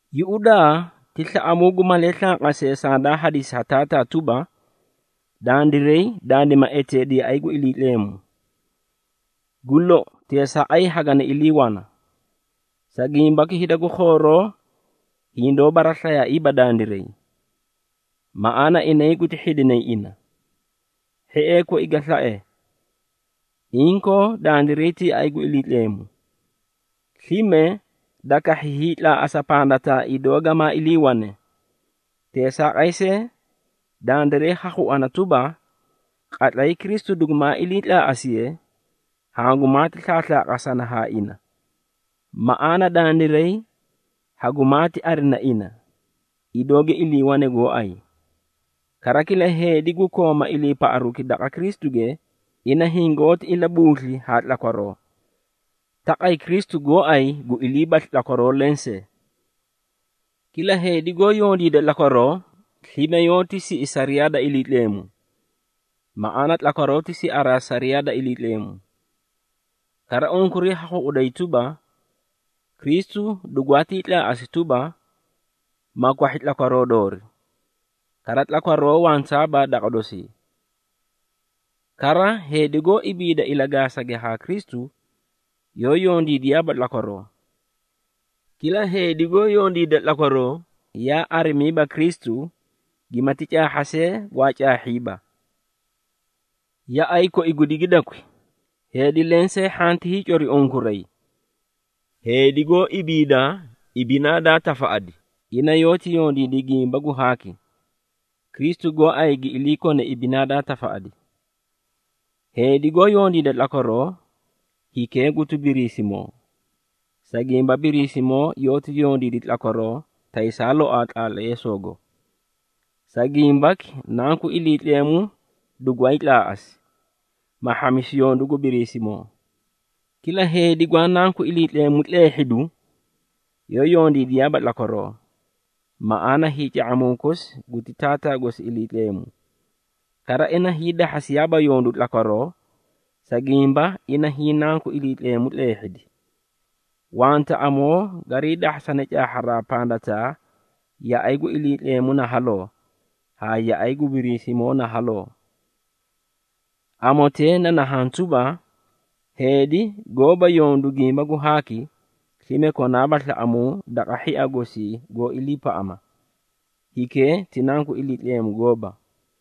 Yuꞌudaa, ti slaꞌamuu gu malee slanqasee sandaa hadisi ha Taataa tuba, dandiray dandima eteedi yaꞌay gu Iliitleemu! Gu lou, teesaaqay hagani ilii wana. Sa gimbaki hida gu khooroo hindoó baraslayaaiiba dandiray, maꞌaana inay guti hhidinay ina. Hhiee koi ga slae, inkoo dandiray ti yaꞌay gu Iliitleemu, slime da kahhi hiitlaaꞌasa pandataa idoo gamaa iliiwane. Teesaaqay see, dandiray ha khuana tuba, qatlay Kristu dugumaa iliitlaaꞌasiye, hangumaati slaaslaaqasana haa ina, maꞌaana dandiray hugumaati arina ina, idoo gi iliiwane gooay. Kara, kila heedi gu kooma iliipaꞌaruki daqa Kristuge, ina hingoóti ilabuusli haa tlakwaroo, taqay Kristu gooay gu iliibaslu tlakwaroo lensee. Kila heedi goó yondiida tlakwaroo, slime yoóti siꞌi sariyaa da Iliitleemu. Maꞌaana tlakwaroo ti siaraa sariyaa da Iliitleemu. Kara, unkuray ha khuꞌuday tuba, Kristu dugwaatii tlaaꞌasi tuba, ma kwahhi tlakwaroo doori, kara tlakwaroo wantaaba daqa dosii. Kara, heedi goó ibiida ilagaasage haa Kristu, yoó yondiidiyaaba tlakwaroo. Kila heedi goó yondiida tlakwaroo, yaa arimiiba Kristu, gimati caahha see, gwaa caahhiiba. Yaꞌay koi gu digidakwi, heedi lensee hhanti hiicori unkuray. Heedi goó ibiida ibinaa daa tafaꞌadi, ina yoóti yondiidi gimba gu haaki, Kristu gooay gi ilii kone ibinaa daa tafaꞌadi. Heedi goó yondiida tlakwaroo, hikee guti Biriisimoo, sa gimba Biriisimoo yoóti yondiidi tlakwaroo taysaa loaa tlaatleesoogo. Sa gimbaki, Nanku Iliitleemu dugwaay tlaaꞌasi, ma hhamisi yondu gu Biriisimoo. Kila heedi gwaa nanku Iliitleemu tleehhidu, yoó yondiidiyaaba tlakwaroo, maꞌaana hiica⁄amuu kosi guti taataa gosi Iliitleemu. Kara ina hiidahhasiyaaba yondu tlakwaroo, sa gimba ina hiĩ nanku Iliitleemu tleehhidi. Wanta amoo garii dahhasane caahharaa pandataa yaꞌay gu Iliitleemu na haloo haa yaꞌay gu Biriisimoo na haloo. Amotee na nahaã tuba, heedi goóba yondu gimba gu haaki, slime konaaba slaꞌamuu daqa hhia gosii goó iliipaꞌama, hikee ti nanku Iliitleemu gooba.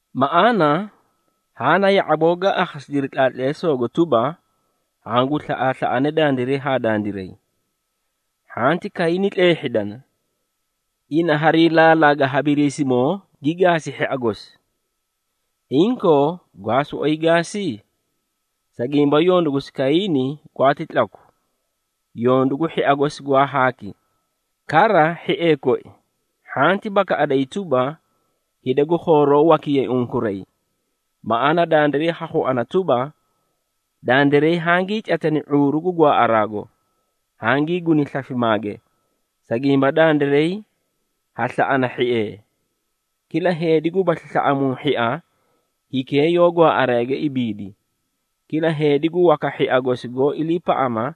Maꞌaana, haã na ya⁄aboo gaa akhasidiri tlaatleesoogo tuba, hangu slaꞌaaslaꞌanee dandiray haa dandiray. Hhanti Kayiini tleehhidana, ina harii laalaga ha Biriisimoo gi gaasi hhia gosi. Inkoo gwaa soꞌoyi gaasi? Sa gimba yondu gosi Kayiini gwaati tlaku, yondu gu hhia gosi gwaa haaki. Kara, hhiee koi, hhanti bakaꞌadayi tuba, hida gu khooroo wakiyay unkuray. Maꞌaana dandiray ha khuana tuba, dandiray hangii catani ⁄uuru gu gwaaꞌaraago, hangii guni slafimaage, sa gimba dandiray ha slaꞌana hhiee. Kila heedi gubasli slaꞌamuu hhia, hikee yoó gwaaꞌaraage ibiidi. Kila heedi gu waka hhia gosi goó iliipaꞌama,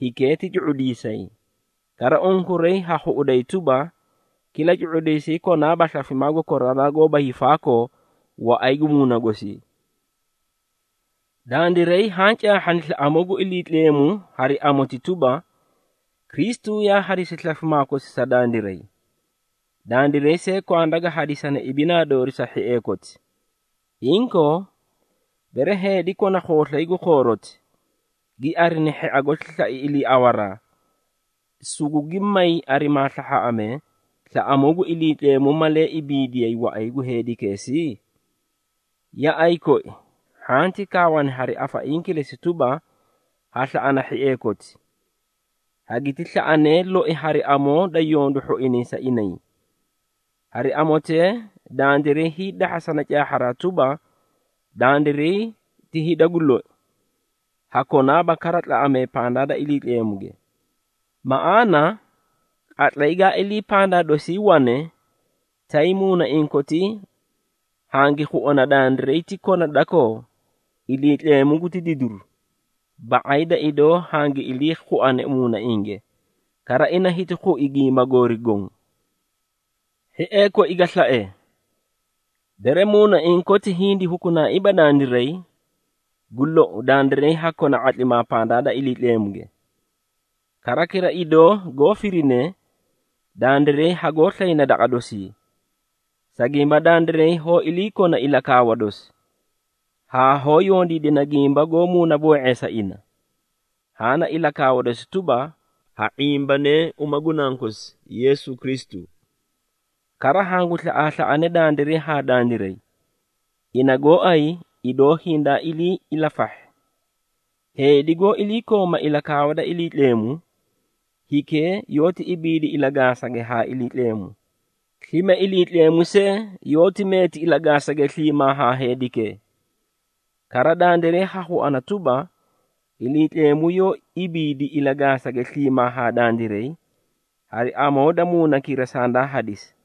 hikee ti cu⁄udiisay. Kara unkuray ha khuꞌuday tuba, kila cu⁄udiisay konaaba slafimaa gu koraraa haa koraraa goóba hiifaakoo waꞌay gu muuna gosii. Dandiray haã caahhani slaꞌamuu gu Iliitleemu hari amoti tuba, Kristu yaa hadisi slafimaa kosi sa dandiray. Dandiray see kwanda ga hadisane ibinaa doori sa hhiee koti. Inkoo, bere heedi kona khooslay gu khooroti, gi arina hhia gosi slai iliiawaraa, sugugi may arimaa slahhaaꞌamee, slaꞌamuu gu Iliitleemu malee ibiidiyay waꞌay gu heedikeesii? Yaꞌay koi, hhanti kaawana hari afaiĩ kilesi tuba, ha slaꞌana hhiee koti, hagiti slaꞌanee loi hari amoo da yondu hhoinay sa inay. Hari amotee, dandiray hiidahhasana caahharaa tuba, dandiray ti hida gu loi, ha konaaba kara tlaꞌamee pandaa da Iliitleemuge. Maꞌaana, qatlay ga ilii pandaa dosii wane, tay muunaiĩ kotii hangi khuana dandiray ti kona dakoo, Iliitleemu guti didiru ba⁄ay da idoo hangi ilii khuane muunainge, kara ina hiti khui gimba goori goõ. Hhiee koi ga slae, bere muunaiĩ koti hindi hukunaaiiba dandiray, gu lou, dandiray ha kona ⁄atlimaa pandaa da Iliitleemuge. Kara, kila idoo goó firine, dandiray hagoó slayna daqa dosii, sa gimba dandiray hoó iliikona ilakaawa dosi, haa hoó yondiidana gimba goó muunaboo⁄eesa ina. Haã na ilakaawa dosi tuba, ha ⁄imbanee uma gu nankosi, Yeesu Kristu. Kara hangu slaꞌaaslaꞌanee dandiray haa dandiray, ina gooay idoo hindaa ilii ilafahhi. Heedi goó iliikooma ilakaawa da Iliitleemu, hikee yoóti ibiidi ilagaasage haa Iliitleemu. Slime Iliitleemu see, yoóti meeti ilagaasage sliimaa haa heedikee. Kara, dandiray ha khuana tuba, Iliitleemu yoó ibiidi ilagaasage sliimaa haa dandiray, hari amoo da Muunakira sandaa hadisi.